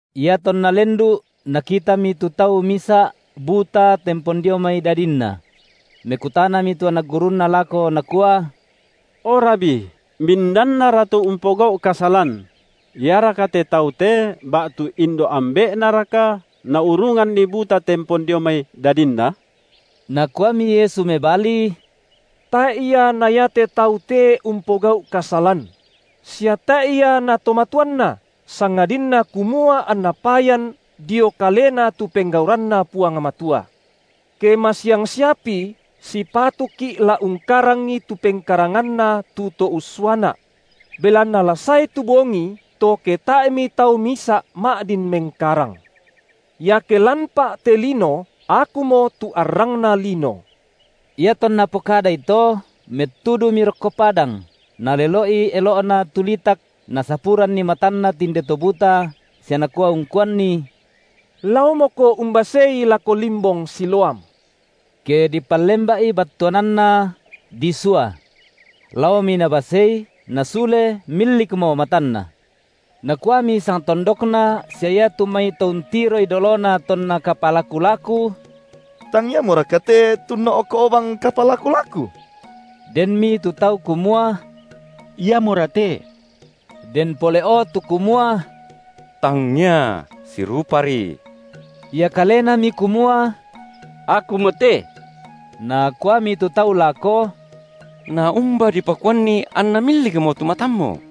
Iatonna lendu’, Nakitami tu tau misa’ buta tempon dio mai dadinna. Mekutanami tu anak gurunNa lako nakua: O Rabi, mindannara tu umpogau’ kasalan: iaraka te taute ba’tu indo’ ambe’naraka, naurunganni buta tempon dio mai dadinna? Nakuami Yesu mebali: Tae’ ia na iate tau te umpogau’ kasalan; sia tae’ ia na to matuanna, sangadinna kumua anna payan dio kalena tu penggauranNa Puang Matua. Ke masiang siapi sipatuki’ la ungkarangi tu pengkaranganNa tu To ussuaNa’. Belanna la sae tu bongi to ke tae’mi tau misa’ ma’din mengkarang. Iake lanPa’ te lino, Akumo tu arrangna lino. Iatonna pokadai to, mettudumi rokko padang, Nalelo’i elo’Na tu litak, Nasapuranni matanna tinde to buta, sia Nakua ungkuanni: Laomoko umbasei lako limbong Siloam!, ke dipallemba’i battuananna: Disua. Laomi nabasei, nasule millikmo matanna. Nakuami sangtondokna sia iatu mai to untiroi dolona tonna kapalaku-laku: Tang iamoraka te tu unno’ko’ bang kapalaku-laku? Denmi tu tau kumua: Iamora te. Den pole’o tu kumua: Tangia, sirupari. Ia kalenami kumua: Akumote. Nakuami tu tau lako: Naumba dipakuanni anna millikmo tu matammu?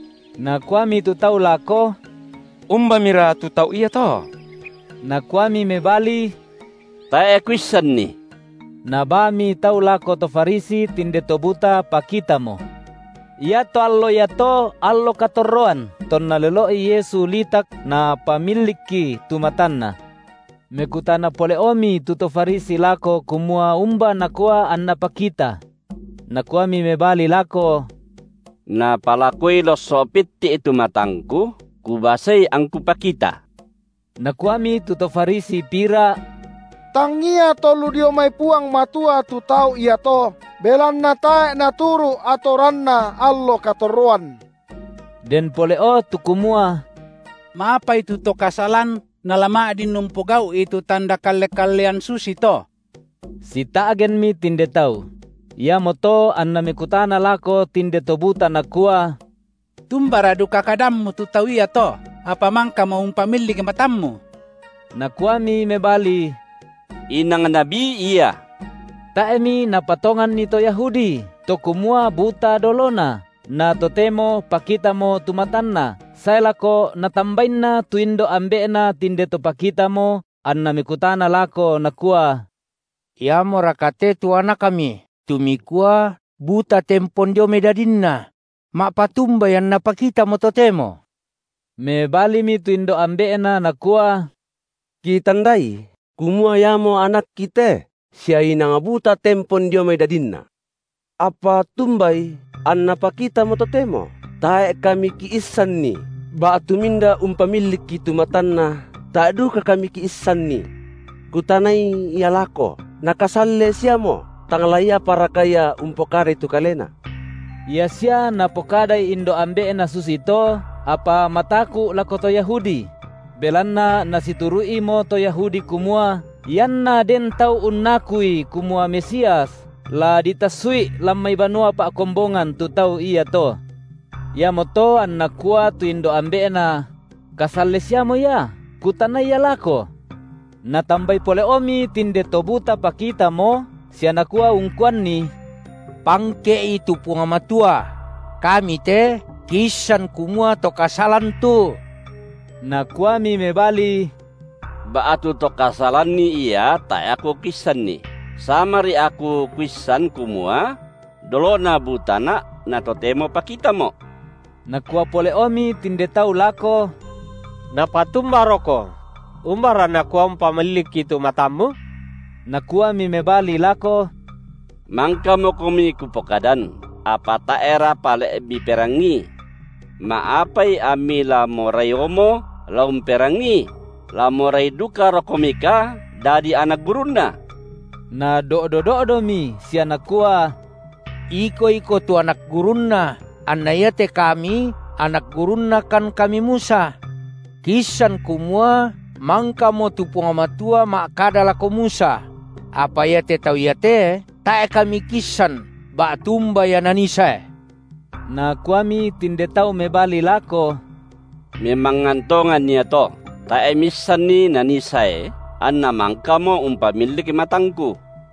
Nakuami tu tau lako: Umbamira tu tau iato? Nakuami mebali: Tae’ kuissanni. Nabaami tau lako to Farisi tinde to buta pakitamo. Iato allo iato allo katorroan tonna lelo’i Yesu litak Napamillikki tu matanna. Mekutana pole’omi tu to Farisi lako kumua umba nakua anna pakita. Nakuami mebali lako: Napalakoi losso’ pitti’ tu matangku, kubasei angku pakita. Nakuami tu to Farisi pira: Tangia To lu dio mai Puang Matua tu Tau iato, belanna tae’ Naturu’ atoranna allo katorroan. Den pole’o tu kumua: Ma’apai tu to kasalan nala ma’din umpogau’i tu tanda kalle-kallean susito? Sita’genmi tinde tau. Iamoto anna mekutana lako tinde to buta nakua: Tumbara duka kadammu tu Tau iato, apa mangkamo umpamillik matammu? Nakuami mebali: Inang nabi Ia. Tae’mi napatonganni to Yahudi, to kumua buta dolona, na totemo pakitamo tu matanna, sae lako natambainna tu indo’ ambe’na tinde to pakitamo, anna mekutana lako nakua: Iamoraka te tu anakmi tu mikua buta tempon dio mai dadinna? Ma’patumbai anna pakitamo totemo? Mebalimi tu indo’ ambe’na nakua: Kitandai kumua iamo anakki te, sia inang buta tempon dio mai dadinna; apa tumbai anna pakitamo totemo, tae’ kami kiissanni, ba’tu minda umpamillikki tu matanna tae’ duka kami kiissanni. Kutanai ia lako, nakasalle siamo, tang la iaparaka ia umpokadai tu kalena. Ia sia napokadai indo’ ambe’na susito, apa mataku’ lako to Yahudi; belanna nasituru’imo to Yahudi kumua, ianna den tau unnakuI kumua Mesias, la ditassu’i lan mai banua pa’kombongan tu tau iato. Iamoto anna kua tu indo’ ambe’na: kasalle siamo ia, kutanai ia lako. Natambai pole’omi tinde to buta pakitamo, sia nakua ungkuanni: Pangke’I tu Puang Matua! Kami te kiissan kumua to kasalan tu. Nakuami mebali: Ba’tu to kasalanni Ia tae’ aku kuissan, samari aku kuissan kumua: dolona butana’, na totemo pakitamo’. Nakua pole’omi tinde tau lako: Napatumbaroko? Umbara Nakua umpamillikki tu matammu? Nakuami mebali lako: Mangkamokomi kupokadan, apa tae’ra pale’ miperangii. Ma’apai ammi la moraiomo la umperangii? La morai dukarokomika dadi anak gurunNa? Nado’do-do’domi sia nakua: Iko iko tu anak gurunNa, anna iate kami anak gurunnakan kami Musa. Kiissan kumua mangkamo tu Puang Matua ma’kada lako Musa; apa iate tau iate, tae’ kami kiissan ba’tu umba Ia Nanii sae. Nakuami tinde tau mebali lako: Memangngan tongan iato, tae’ miissanni Nanii sae, anNa mangkamo umpamillik matangku.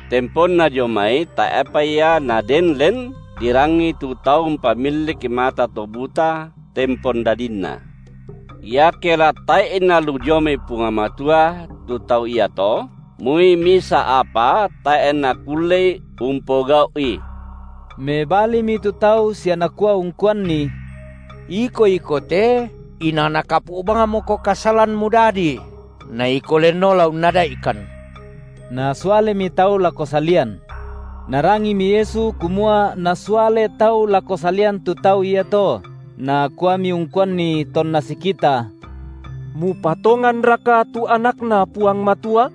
Temponna dio mai tae’pa ia naden len dirangi tu tau umpamillik mata to buta tempon dadinna. Iake la tae’I nalu dio mai Puang Matua tu Tau iato, moi misa’ apa tae’ Nakullei umpogau’i. Mebalimi tu tau sia nakua ungkuanni: Iko iko te inang nakapu’ bangmoko kasalan mudadi, na iko lenno la unnada’ikan! Nasualemi tau lako salian. Narangimi Yesu kumua nasuale tau lako salian tu tau iato, Nakuami ungkuanni tonna sikita: Mupatonganraka tu AnakNa Puang Matua?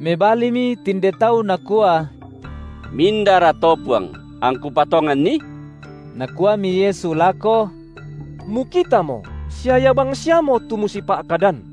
Mebalimi tinde tau nakua: Mindara to, Puang, angku patonganNi? Nakuami Yesu lako: Mukitamo, sia Ia bangsiamo tu musipa’kadan.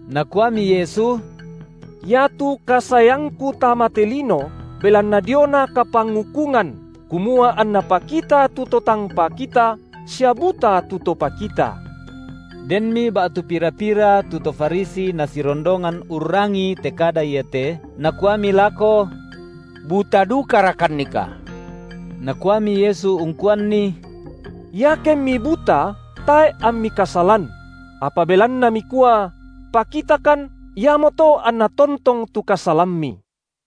Nakuami Yesu: Iatu kasaeangKu tama te lino, belanna diona kapangukungan, kumua anna pakita tu to tang pakita, sia buta tu to pakita. Denmi ba’tu pira-pira tu to Farisi Nasirondongan urrangii te kada iate, nakuami lako: Buta dukarakannika? Nakuami Yesu ungkuanni: Iakemmi buta, tae’ ammi kasalan; apa belanna mikua: pakitakan, iamoto anna tontong tu kasalammi.